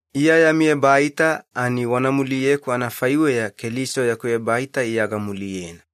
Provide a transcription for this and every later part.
Iya yami ebaita ani wana muliyeku anafaiweya Keliso yaku ebaita Iya gamuliyena.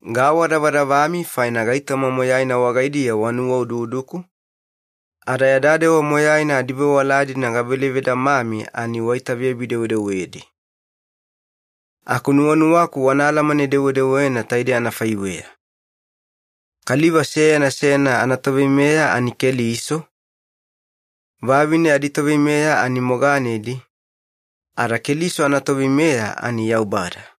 Gaawadavadavami faina gaitoma moyaina wagaidiya wanuwaududuku, ada yada dewa moyaina adivewala-dina gavele vedamami ani waitaveyabi-dewedewedi. Aku nuwanuwaku wana alamane-dewedewena taidei anafaiweya. Kaliva seyana seyana anatoveimeya ani Keliso, vavine aditoveimeya ani moganedi, ada Keliso anatoveimeya ani Yaubada.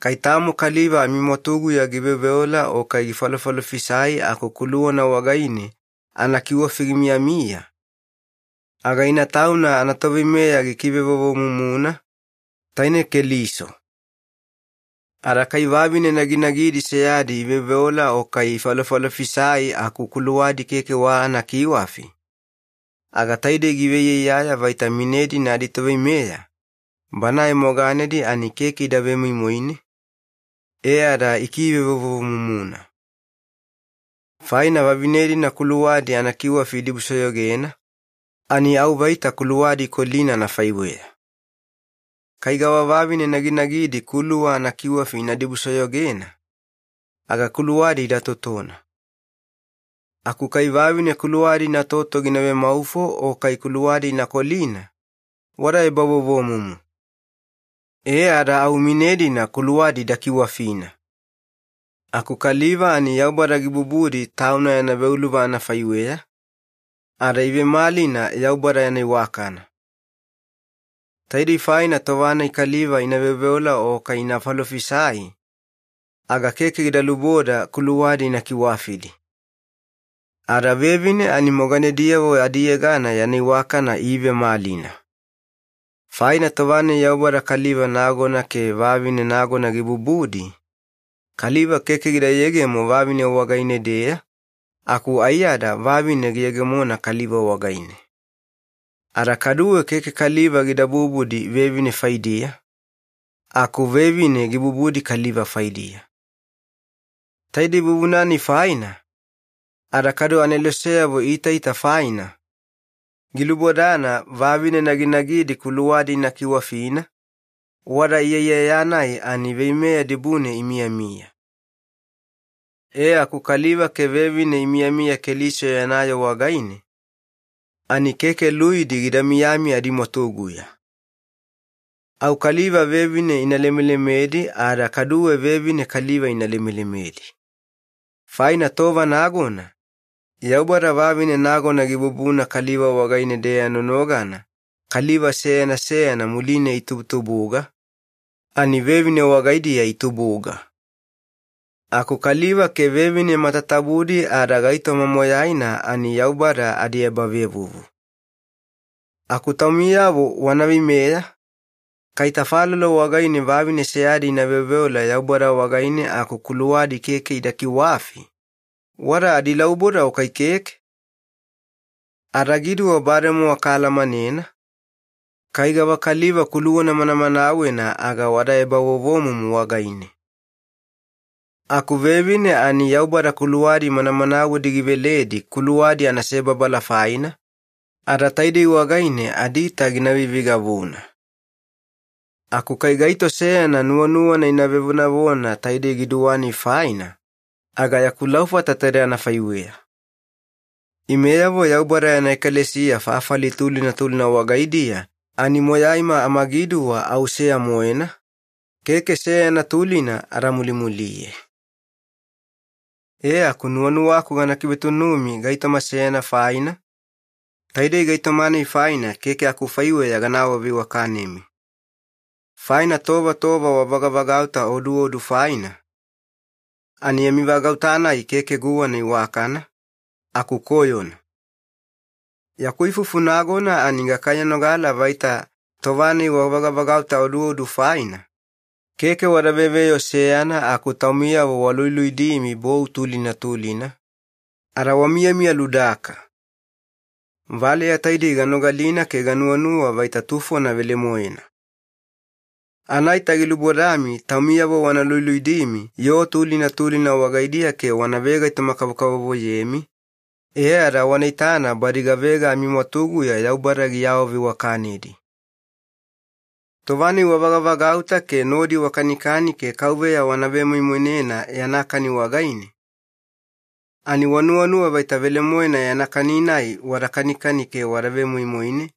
Kai tamo kaliva amimwatuguya giveoveola o kai gifalofalofisai aku kuluwana wagaine anakiwafi gimiyamiya, aga ina tauna anatoveimeya gikivevovomumuna, taine Keliso. Ada kai vavine naginagidi seyadi iveoveola o kai ifalofalofisai aku kuluwadi keke wa anakiwafi, aga taidei giveiyaiyaya vaita mine-dina aditoveimeya, banae moganedi ani keke ida vemoimoine, e ada ikivevovomumuna. Faina vavine-dina kuluwadi anakiwafi idibusoyogena, ani au vaita kuluwadi ikolina anafaiweya. Kai gavavavine naginagidi kuluwa anakiwafi ina dibusoyogena, aga kuluwadi ida totona. Aku kai vavine kuluwadi inatoto gina vemaufo o kai kuluwadi ina kolina, wada ebavovomumu. E ada au mine-dina kuluwadi ida kiwafina. Aku kaliva ani Yaubada gibubudi Tauna yana veuluva anafaiweya, ada iivemalina Yaubada yana iwakana. Taidei faina tova-nai kaliva ina veoveola o kai ina falofisai, aga keke gida luboda kuluwadi ina kiwafidi. Ada vevine ani moganediyavo adiyegana yana iwakana iivemalina. Faina tova-nai Yaubada kaliva nagona ke vavine nagona gibubudi, kaliva keke gida yegemo vavine wagaine-deya, aku aiyada vavine giyegemona kaliva wagaine. Ada kaduwe keke kaliva gida bubudi vevine faidiya, aku vevine gibubudi kaliva faidiya. Taidei vuvuna-nai faina, ada kadu aneloseyavo iitaita faina, gilubodana vavine naginagidi kuluwadi ina kiwafina, wada iyaiyaya-nai ani veimeya dibune imiyamiya. E aku kaliva ke vevine imiyamiya Keliso yana yoo wagaine, ani keke luidi gida miyami adimwatuguya. Au kaliva vevine ina lemelemedi ada kaduwe vevine kaliva ina lemelemedi. Faina tova nagona, Yaubada vavine nagona gibubuna kaliva wagaine-deya nonogana kaliva seyana seyana muline itubutubuga, ani vevine wagaidiya itubuga. Aku kaliva ke vevine matatabudi ada gaitoma moyaina ani Yaubada adiebavevuvu. Aku taumiyavo wana veimeya, kai tafalolo wagaine vavine seyadi ina veoveola Yaubada wagaine aku kuluwadi keke ida kiwafi, wada adilauboda o kai keke? Adagiduwa bademowa kaalamanena, kai gavakaliva kuluwana manamanawena aga wada ebavovomumu wagaine. Aku vevine ani Yaubada kuluwadi manamanawedi giveledi kuluwadi anasebabala faina, ada taidei wagaine adiita gina veiveigavuna. Aku kai gaito seyana nuwanuwana ina vevonavona taidei giduwa-nai faina, aga yaku laufata taide anafaiweya. Imeyavo Yaubada yana ekalesiya fafali tulina tulina wagaidiya ani moyaima amagiduwa au seya-moena, keke seyana tulina ada mulimuliye. E aku nuwanuwaku gana kivetunumi gaitoma seyana faina, taidei gaitoma-nai faina keke akufaiweya gana awaveiwakanemi. Faina tova tova wavagavagauta oduodu faina, ani yami vagauta-nai keke guwana iwakana, aku koyona. Yaku ifufu nagona ani gakaiyanogala vaita tova-nai wavagavagauta oduodu faina, keke wada veveyoo seyana aku taumiyavo waluluidimi bou tulina tulina, ada wamiyamiya ludaka. Valeya taidei ganogalina ke ganuwanuwa vaita tufona velemoena. Anaita gilubodami taumiyavo wana luluidimi yoo tulina tulina wagaidiya ke wana vegaitoma-kavokavovoyemi, e ada wana itana badi gavega amimwatuguya Yaubada giawaveiwakanedi. Tova-nai wavagavagauta ke nodi wakanikani ke Kauveya wana vemoimoinena yana kani wagaine, ani wanuwanuwa vaita velemoena yana kani-nai wada kanikani ke wada vemoimoine,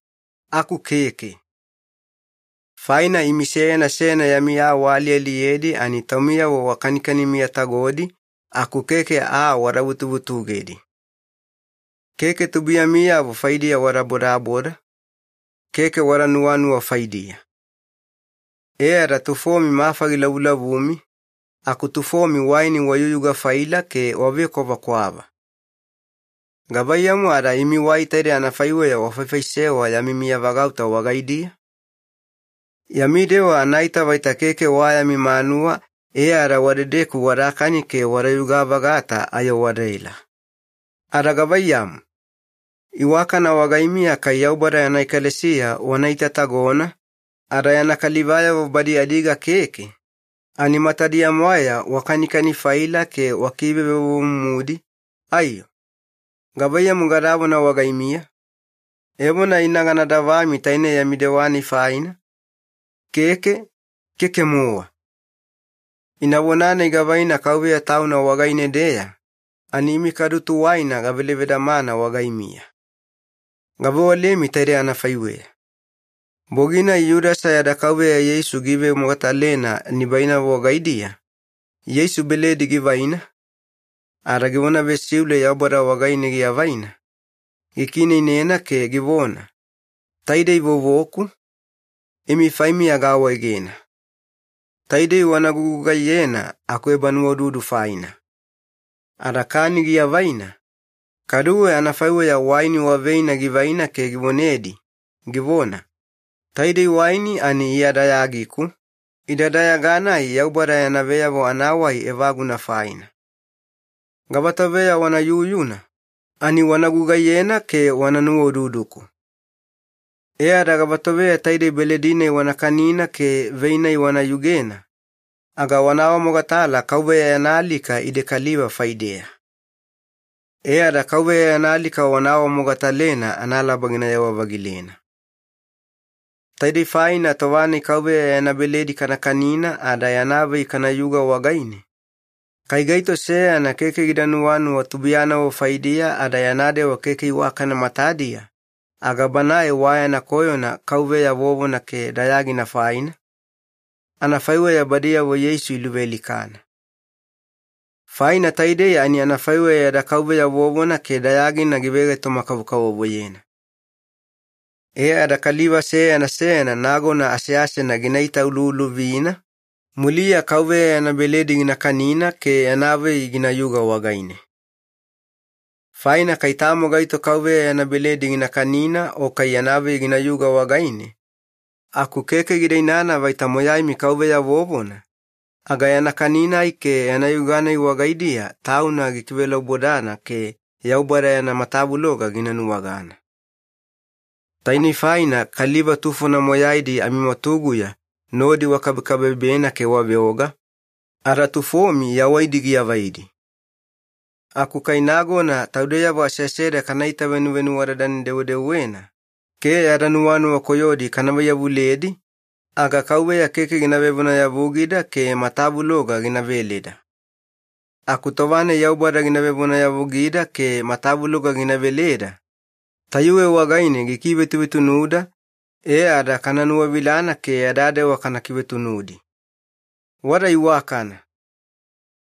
aku keke. Faina imi seyana seyana yami aa waalialiyedi ani taumiyavo wakanikani miyatagodi, aku keke aa wada vutuvutugedi. Keke tubuiyamiyavo faidiya wada bodaboda, keke wada nuwanuwa faidiya. E ada tufomi mafa gilavulavumi, aku tufomi waini wayuyuga-faila ke wavekwavakwava. Gavaiyamu ada imi wai taide anafaiweya wafaifaisewa yami miyavagauta wagaidiya? Yami dewa anaita vaita keke wa yami manuwa e ada wadedeku wadakani ke wadayuga-vagata ayo wadaela. Ada gavaiyamu? Iwakana wagaimiya kai Yaubada yana ekalesiya wana itatagona, ada yana kalivayavo badi adiga keke, ani matadiya-mwaeya wakanikani-faila ke wakivevovomumudi, aiyo? Gavaiyamu gadavona wagaimiya? Evona ina gana davami taine yami dewa-nai faina? Keke, keke-mowa! Ina vona-nai gavaina Kauveya Tauna wagaine-deya, ani imi kadu tuwaina gavele vedamana wagaimiya. Gavewalemi taidei anafaiweya. Bogi-nai Yudasa yada Kauveya Yeisu giivemogatalena nibainavo wagaidiya, Yeisu beledi givaina, ada givona vesiule Yaubada wagaine giavaina, gikiineinena ke givona, “Taidei vovoku, imi faimiya gaawaegena. Taidei wana gugugaiyena akuebanuwaududu faina.” Ada kani giavaina, kaduwe anafaiweya waini wa veina givaina ke givonedi, givona, “Taidei waini ani Iya dayagiku, ida dayaga-nai Yaubada yana veyavo anawai evaguna faina. Gavatoveya wana yuyuna, ani wana gugaiyena ke wana nuwaududuku.” E ada gavatoveya taidei beledi-nai wana kanina ke vei-nai wana yugena, aga wana awamogatala Kauveya yana alika ide kaliva faideya. E ada Kauveya yana alika wana awamogatalena analaba ginayewa-vagilena. Taidei faina tova-nai Kauveya yana beledi kana kanina ada yana vei kanayuga wagaine, kai gaito seyana keke gida nuwanuwa tubuiyanavo faidiya ada yana dewa keke iwakana matadiya, aga banae wa yana koyona Kauveya vovona ke dayagina faina, anafaiweya badiyavo Yeisu iluvealikana. Faina taidei ani anafaiweya yada Kauveya vovona ke dayagina givegaitoma-kavokavovoyena. E ada kaliva seyana seyana nagona aseasena gina itauluuluvina, muliya Kauveya yana beledi gina kanina ke yana vei ginayuga wagaine. Faina kai tamo gaito Kauveya yana beledi gina kanina o kai yana vei ginayuga wagaine aku keke gida inana vaita moyaimi Kauveya vovona, aga yana kani-nai ke yana yuga-nai wagaidiya tauna gikivelaubodana ke Yaubada yana matavuloga gina nuwagana. Tainei faina kaliva tufona moyaidi amimwatuguya nodi wakabekabebena ke waveoga, ada tufomi yawaidi giavaidi. Aku kai nagona taudeyavo aseaseda kana itavenuvenuwadadane-dewedewena ke yada nuwanuwa koyodi kana vaiyavuledi, aga Kauveya keke gina vevonayavugida ke matavuloga gina veleda. Aku tova-nai Yaubada gina vevonayavugida ke matavuloga gina veleda, tayuwe wagaine gikivetuvetunuda e ada kana nuwavilana ke yada dewa kana kivetunudi. Wada iwakana.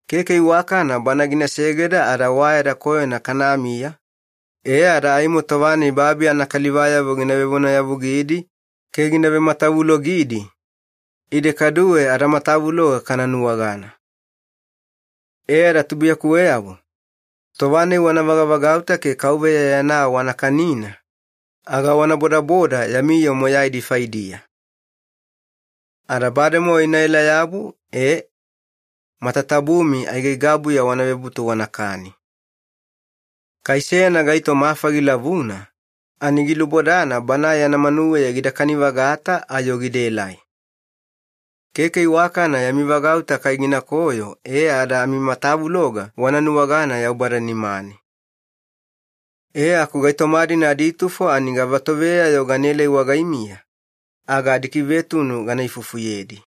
Keke iwakana Bana gina segeda ada wa yada koyona kanamiya, e ada aimo tova-nai babi anakalivayavo gina vevonayavugidi ke gina vematavulogidi, ide kaduwe adamatavuloga kana nuwagana. E ada tubuiyakuweyavo, tova-nai wana vagavagauta ke Kauveya yana aa wana kanina, aga wana bodaboda yami yoo moyaidi faidiya. Ada bademowa inaela-yabu ee, matatabumi aigaigabuya wana vebutu wanakani. Kai seyana gaito mafa gilavuna, ani gilubodana banae yana manuweya gida kani-vagata ayo gidaelai. Keke iwakana yami vagauta kai ginakoyo e ada amimatavuloga wana nuwagana Yaubada nimane. E aku gaitoma-dina aditufo ani gavatoveya-yo ganaelai wagaimiya, aga adikivetunu gana ifufuyedi.